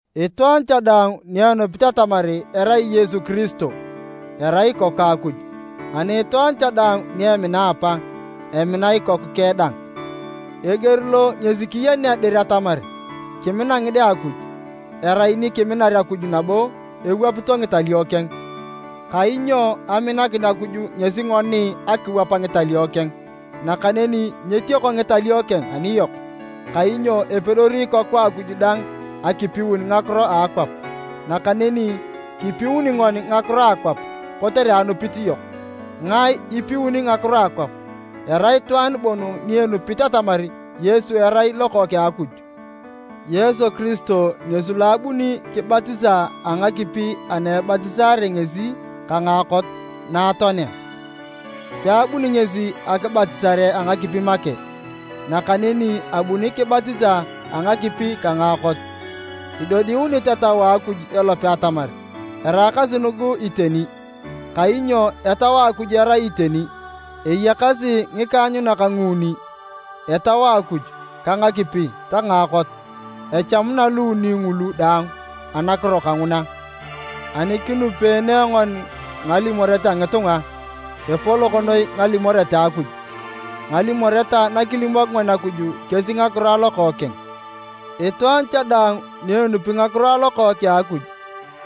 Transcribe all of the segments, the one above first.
Itwaan cha daang ni enupit atamar erai Yesu Kiristo, erai ikoku a Akuj, ani itwaan cha daang ni emina apa, emina ikoku keng dang. Eger lo ngesi kiyenea dir atamar kimina ngide a Akuj, erai ni kiminar Akuj nabo ewapito ngitalio keng. Kainyo aminakin Akuj ngesi ngoni akiwap ngitalio keng. Nakaneni nyetioko ngitalio keng aniyok, kainyo epedori ikoku a Akuj daang akipiun ngakiro a akwap. Nakaneni kipiuni ngoni ngakiro a akwap kotere anupit yok. Ngae ipiuni ngakiro a akwap? Erai itwaan bon ni enupit atamar Yesu erai Lokookeng a Akuj. Yesu Kiristo ngesi lo abuni kibatisa a ngakipi ana ebatisaare ngesi ka ngaakot na atoanea. Peabuni ngesi akibatisare a ngakipi make, nakaneni abuni kibatisa a ngakipi ka ngaakot. Idodiunit Etau a Akuj elope atamar eraakasi nugu iteni, kainyo Etau a Akuj erai iteni. Eyakasi ngikaanyunak nguuni, Etau a Akuj, ka ngakipi ta ngaakot. Echamuna luuni ngulu daang anakiro kanguna. Ani kinupeene ngoni ngalimoret a ngitunga, epolok noi ngalimoret a Akuj. Ngalimoret na kilimok ngoni Akuj kesi ngakiro a Lokookeng. Itwaan cha daang ni enupi ngakiro a Lokookeng a Akuj,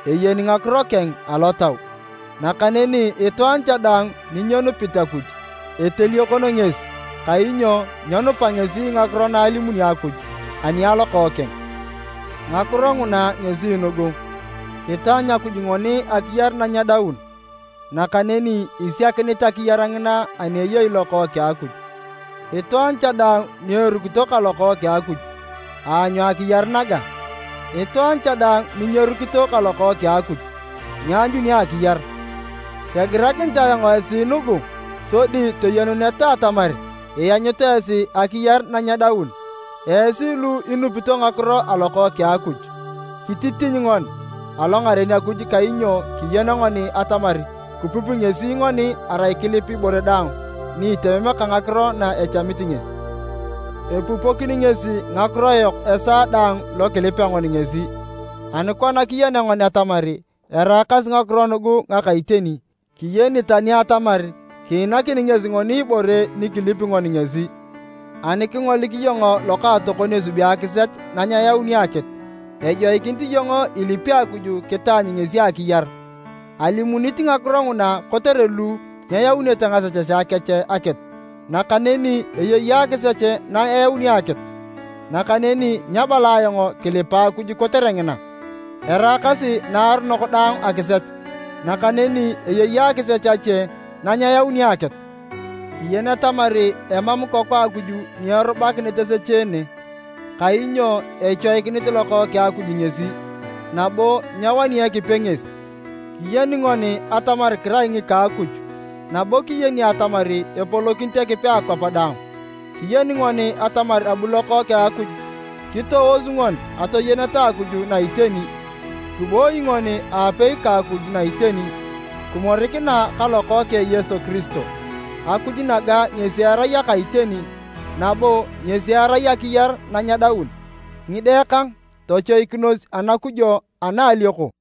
eyeni ngakiro keng alotau, nakaneni itwaan cha daang ni nyenupit Akuj, eteliokon ngesi, kainyo nyenupa ngesi ngakiro na alimuni Akuj ani a Lokookeng. Ngakiro nguna ngesi nugu, kitaanyu Akuj ngoni akiyar na nyedaun, nakaneni isiakinit akiyar ngina ani eyei Lokookeng a Akuj. Itwaan cha daang ni erukito ka Lokookeng a Akuj, aanyu akiyar naga, itwaan cha daang ni nyerukito ka Lokookeng a Akuj, nyeanyuna akiyar. Kegirakinit ayong esi nugu sodi toyenuneta atamar ianyut esi akiyar na nyedaun, esi lu inupito ngakiro a Lokookeng a Akuj. Kititiny ngoni alongaren Akuj kainyo kiyeni ngoni atamar kipupi ngesi ngoni arai kilip ibore daang ni itemem ka ngakiro na echamit ngesi. Epupokini ngesi ngakiro yok esaa daang lo kilipea ngoni ngesi, ani kona kiyenea ngoni atamar eraakasi ngakiro nugu ngaka iteni, kiyeni tani atamar kiinakini ngesi ngoni ibore ni kilipi ngoni ngesi. Ani kingolik iyong lokaatokon esubi akisech na nyeyauni akitu, ejoikinit iyong ilipi Akuj kitaanyu ngesi akiyar. Alimunit ngakiro nguna kotere lu nyeyaunete ngasechesea kech akitu. Nakaneni eyei akisech na eyauni akitu, nakaneni nyabala ayong kilipa Akuj kotere ngina. Eraakasi naaronok daang akisech, nakaneni eyei akisech ache na nyeyauni akitu. Kiyeni atamar emam ikoku a Akuj ni erubakinit esecheene, kainyo echoikinit Lokookeng a Akuj ngesi, nabo nyewani Ekipe ngesi. Kiyeni ngoni atamar kirai ngika Akuj nabo kiyeni atamar epolokinit Ekipe akwap daang. Kiyeni ngoni atamar abu Lokookeng a Akuj kitoosu ngoni atoyeneta Akuj na iteni. Kiboi ngoni aapei ka Akuj na iteni, kimorikina ka Lokookeng Yesu Kiristo. Akuj naga ngesi erai aka iteni, nabo ngesi erai akiyar na nyedaun. Ngide kang, tochoikinos anakujo ana a alioko!